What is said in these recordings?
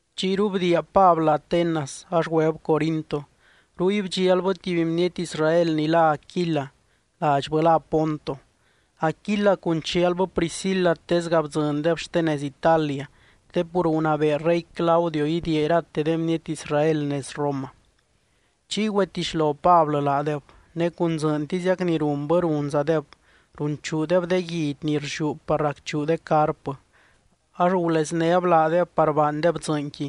Chiyru bdiia Pablɨ Atenas ax güeb Corinto. Ruy bdxialbɨ tuby bniety Israel ni lá Aquila, ladxbɨ lá Ponto. Aquila cun chialbɨ Priscila tesga bdzɨndeb xte nez Italia, te pur gunabee rey Claudio idiia irate de bniety Israel nez Roma. Chiy güetixlo Pablɨ laadeb ne cun dzɨɨntiziac ni runbɨ runzadeb, runchuudeb de guidy ni rlliú par racchuu de carpɨ, ax guleznéb laadeb par baandeb dzɨɨnqui.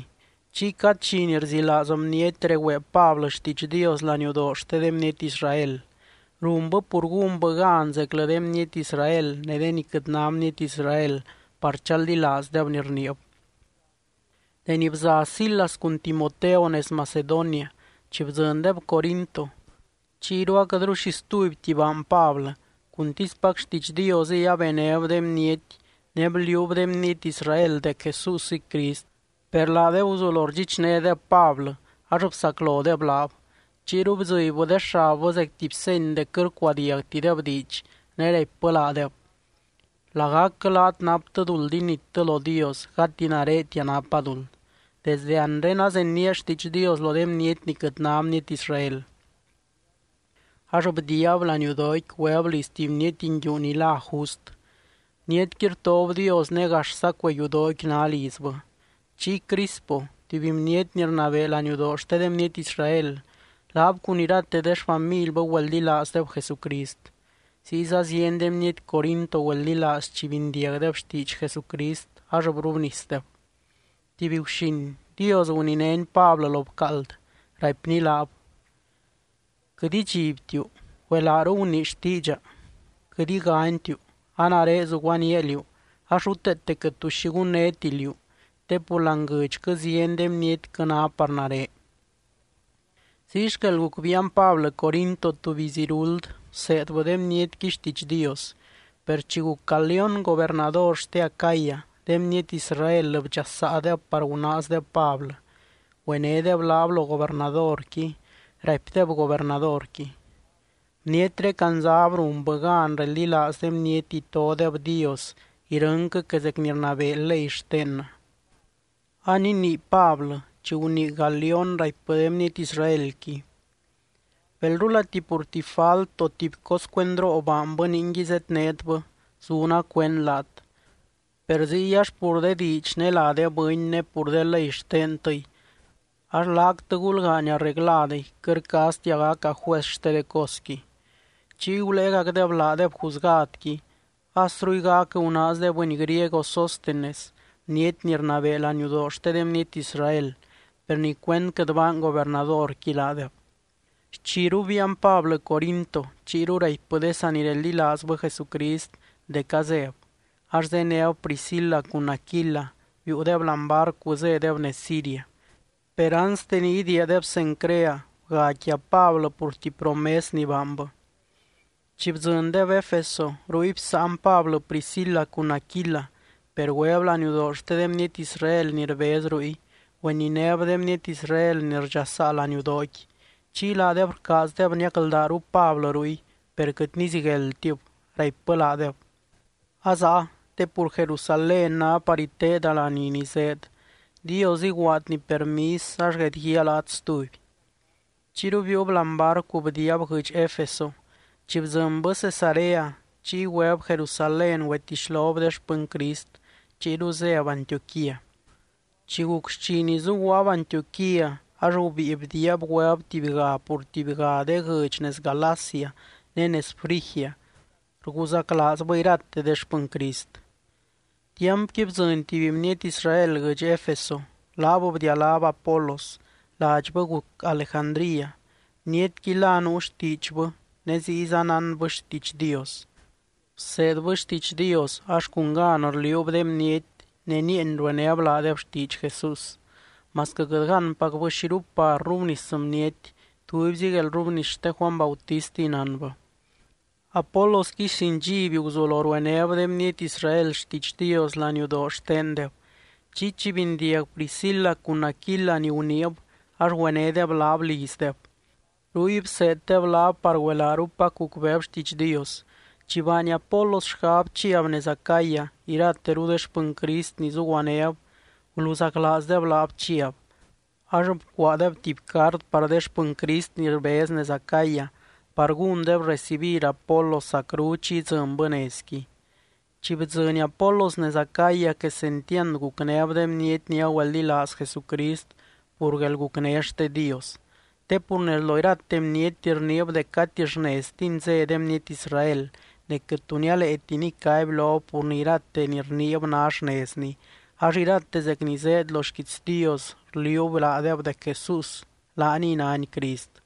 Chiy cad dxi ni rzilaaz bniety regüee Pablɨ xtiidx Dios laniudoo xte de bniety Israel, runbɨ pur gúnbɨ gan zeclɨ de bniety Israel ne de ni quɨt ná bniety Israel par chaldilaazdeb ni rniib. Deni bza Silas cun Timoteo nez Macedonia, chi bdzɨndeb Corinto, chiyru aquɨtru xi stubyti baany Pablɨ, cuntispac xtiidx Diosɨy abenéb de bniety ne bliuub de bniety Israel dec Jesúsɨy Crist. Per laadeb guzulo rdxichnédeb Pablɨ, ax bsaclodeb laab. Chiyru bdzɨbybɨ de xabbɨ zec tuby seny dec quɨt rcuadiagtideb diidx, ne raipbɨ laadeb: —Lagacquɨ laat naptɨ duld inittɨ lo Dios, gati naretia napa duld. Desde anre azenía xtiidx Dios lo de bniety ni quɨt ná bniety Israel. Ax bdiiab laniudooqui, güeb liz tuby bniety nguiu ni lá Just. Bnietqui rtob Dios ne gaxza cuee yudooqui ná lizbɨ. Chiy Crispo, tuby bniety ni rnabee laniudoo xte de bniety Israel, laab cun irate de xfamilbɨ güeldilaazdeb Jesucrist. Ziyza zieny de bniety Corinto güeldilaaz chi bindiagdeb xtiidx Jesucrist ax brubnisdeb. Tuby guxin, Dios guninény Pablɨ lo bcaald, raipny laab: —Quɨt idxibtiu, güelaaru gunii xtiidxa. Quɨt iganytiu, a nare zuguaníaa liú ax ruteete quɨt tu xi gunnéti liú, te pur láani guɨdxquɨ zieny de bnietquɨ ná par nare. Ziy xquel guc biian Pablɨ Corinto tuby iz iruld, bseedbɨ de bnietqui xtiidx Dios. Per chi guc Galión gobernador xte Acaya, de bniety Israel bdxasaadeb par gunaazdeb Pablɨ. Güenédeb laab lo gobernadorqui, raipdeb gobernadorqui: —Bnietré candzab runbɨ gan reldilaaz de bniety itodeb Dios irɨnquɨ que zec ni rnabee ley xtennɨ. Aninii Pablɨ, chi gunii Galión, raipbɨ de bniety Israelqui: —Belrulati pur tuby falt, o tuby cos cuendroo baanbɨ ningui zednétbɨ, zuna cuend laat. Per ziy ax pur de diidx ne lá de bɨny ne pur de ley xtentɨy, ax laactɨ gulgaany arregladɨy, quɨt rcaaztia gaca juez xte de cosqui. Chiy guléegacbɨ laadeb juzgadqui. As ruygac gunaaz de bɨny griego Sóstenes bniety ni rnabee laniudoo xte de bniety Israel, per nicuend quɨt baany gobernadorqui laadeb. Xchiru biian Pablɨ Corinto. Chiyru raipbɨ de sanireldilaazbɨ Jesucrist dec azéb, ax zéneb Priscila cun Aquila, biiudeb láani barcu zédeb nez Siria. Per anste ni idiiadeb Cencrea bga quia Pablɨ pur tuby promes ni baanbɨ. Chi bdzɨndeb Efeso, ruy bsáan Pablɨ Priscila cun Aquila, per güeb laniudoo xte de bniety Israel ni rbez ruy, güeninéb de bniety Israel ni rdxasaa laniudooqui. Chiy laadeb rcaazdeb niacldaaru Pablɨ ruy, per quɨt nizigueldtib. Raipbɨ laadeb: —Azáa, te pur Jerusalén ná par iteeda laní ni zéed. Dios iguaadny permis ax guedguíaa laat stuby. Chiyru biiub láani barcu bdiiab guɨdx Efeso. Chi bdzɨnbɨ Cesarea, chiy güeb Jerusalén güetixlob de xpɨny Crist, chiyru zéb Antioquía. Chi guc xchi ni zuguaab Antioquía, ax gubíi bdiiab güeb tubyga pur tubyga de guɨdx nez Galacia ne nez Frigia, rguzaclaazbɨ irate de xpɨny Crist. Tiampqui bdzɨny tuby bniety Israel guɨdx Efeso, laab bdialáb Apolos, ladxbɨ guc Alejandría. Bnietqui la nuu xtiidxbɨ ne ziyza nánbɨ xtiidx Dios. Bseedbɨ xtiidx Dios, ax cun gan rliuub de bniety ne nieeny ruenéb laadeb xtiidx Jesús, masquɨ quɨt gánpacbɨ xiru par rrubnis bniety, tubyzi guelrrubnis xte Juany Bautistiy nánbɨ. Apolosqui sin dxiby guzulo ruenéb de bniety Israel xtiidx Dios laniudoo xtendeb, chiy chi bindiag Priscila cun Aquila ni guniib ax güenédeb laab lizdeb. Ruy bseeddeb laab par güelaarupac gucbeeb xtiidx Dios. Chi baany Apolos xgab chiab nez Acaya, irateru de xpɨny Crist ni zuguanéb, guluzaclaazdeb laab chiab, ax bcuaadeb tuby cart par de xpɨny Crist ni rbez nez Acaya par gúndeb recibir Apolos zacru chi idzɨnbɨ nezqui. Chi bdzɨny Apolos nez Acaya quesentiand gucnéb de bniety ni agüeldilaaz Jesucrist pur guelgucné xte Dios. Te pur nez lo irate bniety rniib dec gati xneztini zé de bniety Israel, ne quɨt tu nialeeti nicaby lob pur ni irate ni rniib ná xnezni, ax irate zec ni zéed lo xquiits Dios rliuub laadeb dec Jesús laaniy nány Crist.